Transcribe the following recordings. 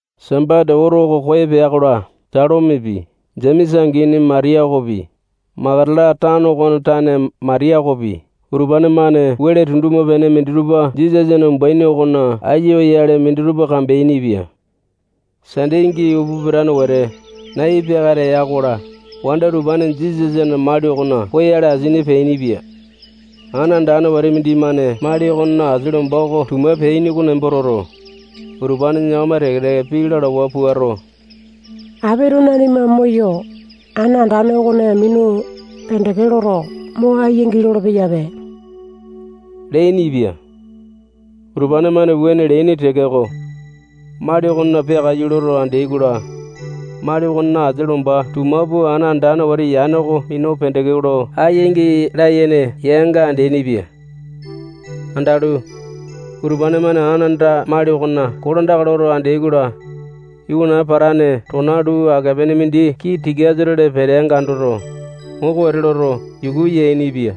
Sambasa oto oko koyo pea-kola, Salomepi, Jemesa angini Matiya okopi, Makatala tano okona tane Matiya okopi, utupane-mane wele tunduma-pene minditupa Jisasana umbuaini okona aiya oyale minditupa kambeainipia. Sande angi upa pitane wete, nai peakata ya-kola, wanda utupane Jisasana mali okona poyale asini peainipia. Ana andane wete mindimane mali okona asia lomba oko tuma pitiyaini oko nembo toto, utupane yakama teke-teke pii lalawa puato, apito nanima moyo, ana andane okone minu pendeke loto, mo aiyangi lolo-peyape leainipia. Utupane-mane wuane leaini tekeko, mali okona peakaiyu loto andeai-kola, mali okona asia lomba tuma pua ana andane wete yane oko minu pendeke lo aiyangi layene yanga andeaini-pia. Andalu, utupane-mane ana anda mali okona kolandaka loto andeai-kola, iwana patane tona luu ake-pene mindi kii tikasa-tole peteanga andoto, moko wete loto, yuku yainipia.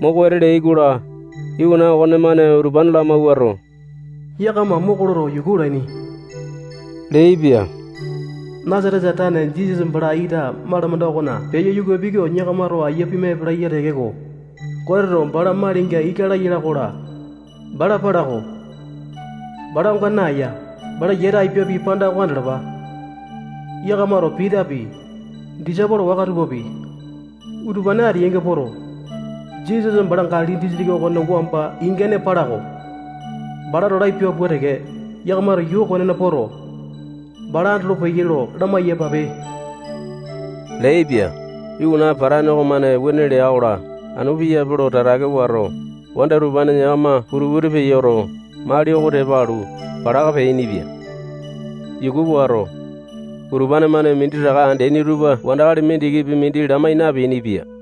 Moko wete leai-kola, iwana okonemane utupane lamawuato, yakama moko loto, yuku olaini leaipia. Nasatesa tane Jisasa bala ita malamanda okona peyo yuka apiai oko yakamato aiya pima epalai ya tekeko, Goteto bala malinga ika laya ala-kola, bala pala-ko. Bala onga naeya. Bala yata apiapi panda oko andalapa. Yakamato Pitapi, disaipolo waka tupapi, utupane ateyainga poto, Jisasa bala Galili disitiki okona wamba ingane pala-ko. Balato lapia pua teke, yakamato yuu okonena poto, bala andolopeyai lo lamai-yapape leaipia. Iwana patane okomane wuane lea-kola, anu piyape lo tatake wato, wanda utupane yakama putu-putu peyoto, mali oko tepa alu, palaka peainipia. Yuku wato, utupane-mane minditaka andeani tupa wandakali mindikipi mindi lamai napeainipia.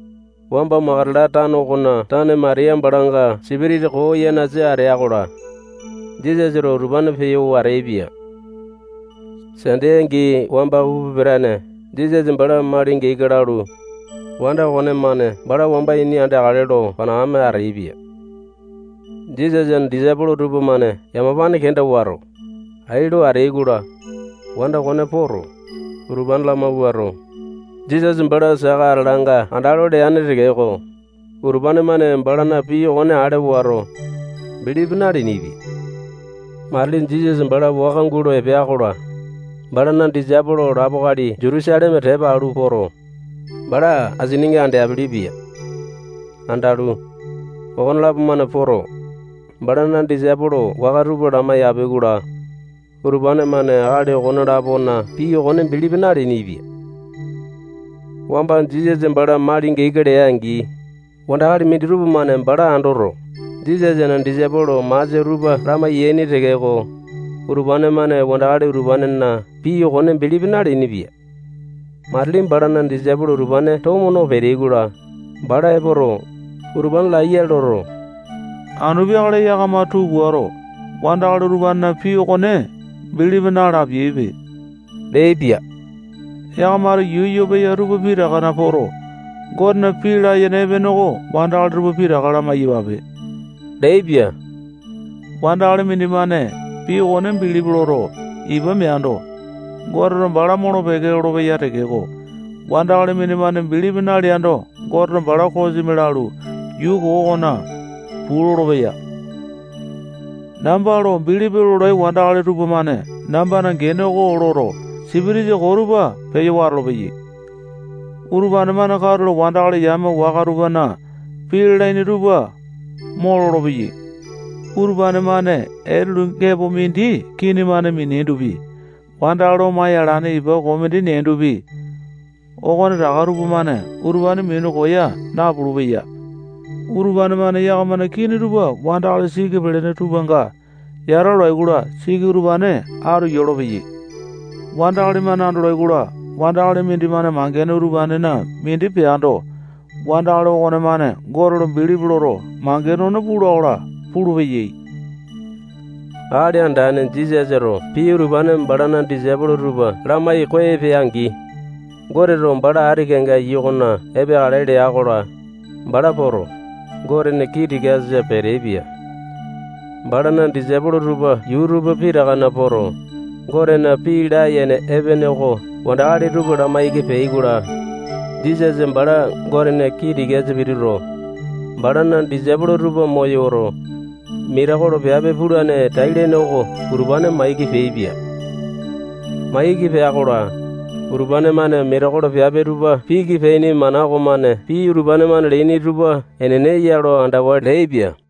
[Wamba Makatala tano okona tane Matiya balanga sipitisa koo yanasa atea-kola, Jisasato utupane peyo wateaipia. Sande angi wamba upa pitane Jisasa bala malinga ika lalu, wanda okonemane bala wamba ini andeakale lo panakame ateaipia. Jisasana disaipolo tupamane yamapane kenda wato, ai lo ateai-kola, wanda okone poto, utupane lamawuato, Jisasa bala saka ateyanga andalo leane tekeko, utupane-mane balana pii okone ale wato, bilipi naleainipia.] [Matili Jisasa bala waka gulo epea-kola, balana disaipolo lapo akali Jutusaleme tepa alu poto, bala asininga andeapele-pia. Andalu, okonelapo-mane poto, balana disaipolo waka tupa lamaiyapi-kola, utupane-mane akali okone-lapona pii okone bilipi naleainipia.] [Wamba Jisasa bala malinga ika lea-angi, wandakali minditupa-mane bala andoto, Jisasana disaipolo masia tupa lamai-yaini tekeko, utupane-mane wandakali utupanena pii okone bilipi naleainipia. Matili balana disaipolo utupane tomo no peteai-kola, bala epoto, utupane laiya loto, anu peakale yakama tuu puato, wandakali utupanena pii okone bilipi na-lapiaipe leaipia. Yakamato yuu yoo peya tupa pitakana poto, Gotena pii layene epene oko wandakali tupa pitaka lamai-yapape leaipia. Wandakali mindimane pii okone bilipi loto, ipa meando, Goteto bala molo-peke lolopeya tekeko, wandakali mindimane bilipi naleando, Goteto bala kosimi lalu, yuu koo okona puu lolopeya.] [Namba lo bilipi lolai wandakali tupamane nambana gene oko loto, sipitisa koo tupa peyo watolo-peyai. Utupane-mane katulo wandakali yame waka tupana pii lalaini tupa mo lolopeyai. Utupane-mane etulu gepo mindi kini-mane miniaindopi, wandakali omaya alane ipa koo mindi neaindopi, okonetaka tupamane utupane minu koya napulu-peya. Utupane-mane yakamana kini tupa wandakali siki pelene tupanga yata olai-kola, siki utupane atu yolopeyai. Wandakali-mane andolai-kola, wandakali mindimane mangene utupanena mindi peando, wandakali okonemane Gote lo bilipi loto, mangene okone pula-kola pulupeyai.] [Akali Andane Jisasato pii utupane balana disaipolo tupa lamai koyo pea-angi, Goteto bala ati kenga iyu okona epeakale lea-kola, bala poto, Gotena kii tikasa peteaipia. Balana disaipolo tupa yuu tupa pitakana poto, Gotena pii layene epene oko wandakali tupa lamaiki peai-kola, Jisasa bala Gotena kii tikasa pituto, balana disaipolo tupa moyoto, metekolo piape pulane tai-lene oko utupane maiki peaipia. Maiki pea-kola, utupane-mane metekolo piape tupa piki peaini mana okomane pii utupane-mane leaini tupa enene ya lo andawa leainipia.]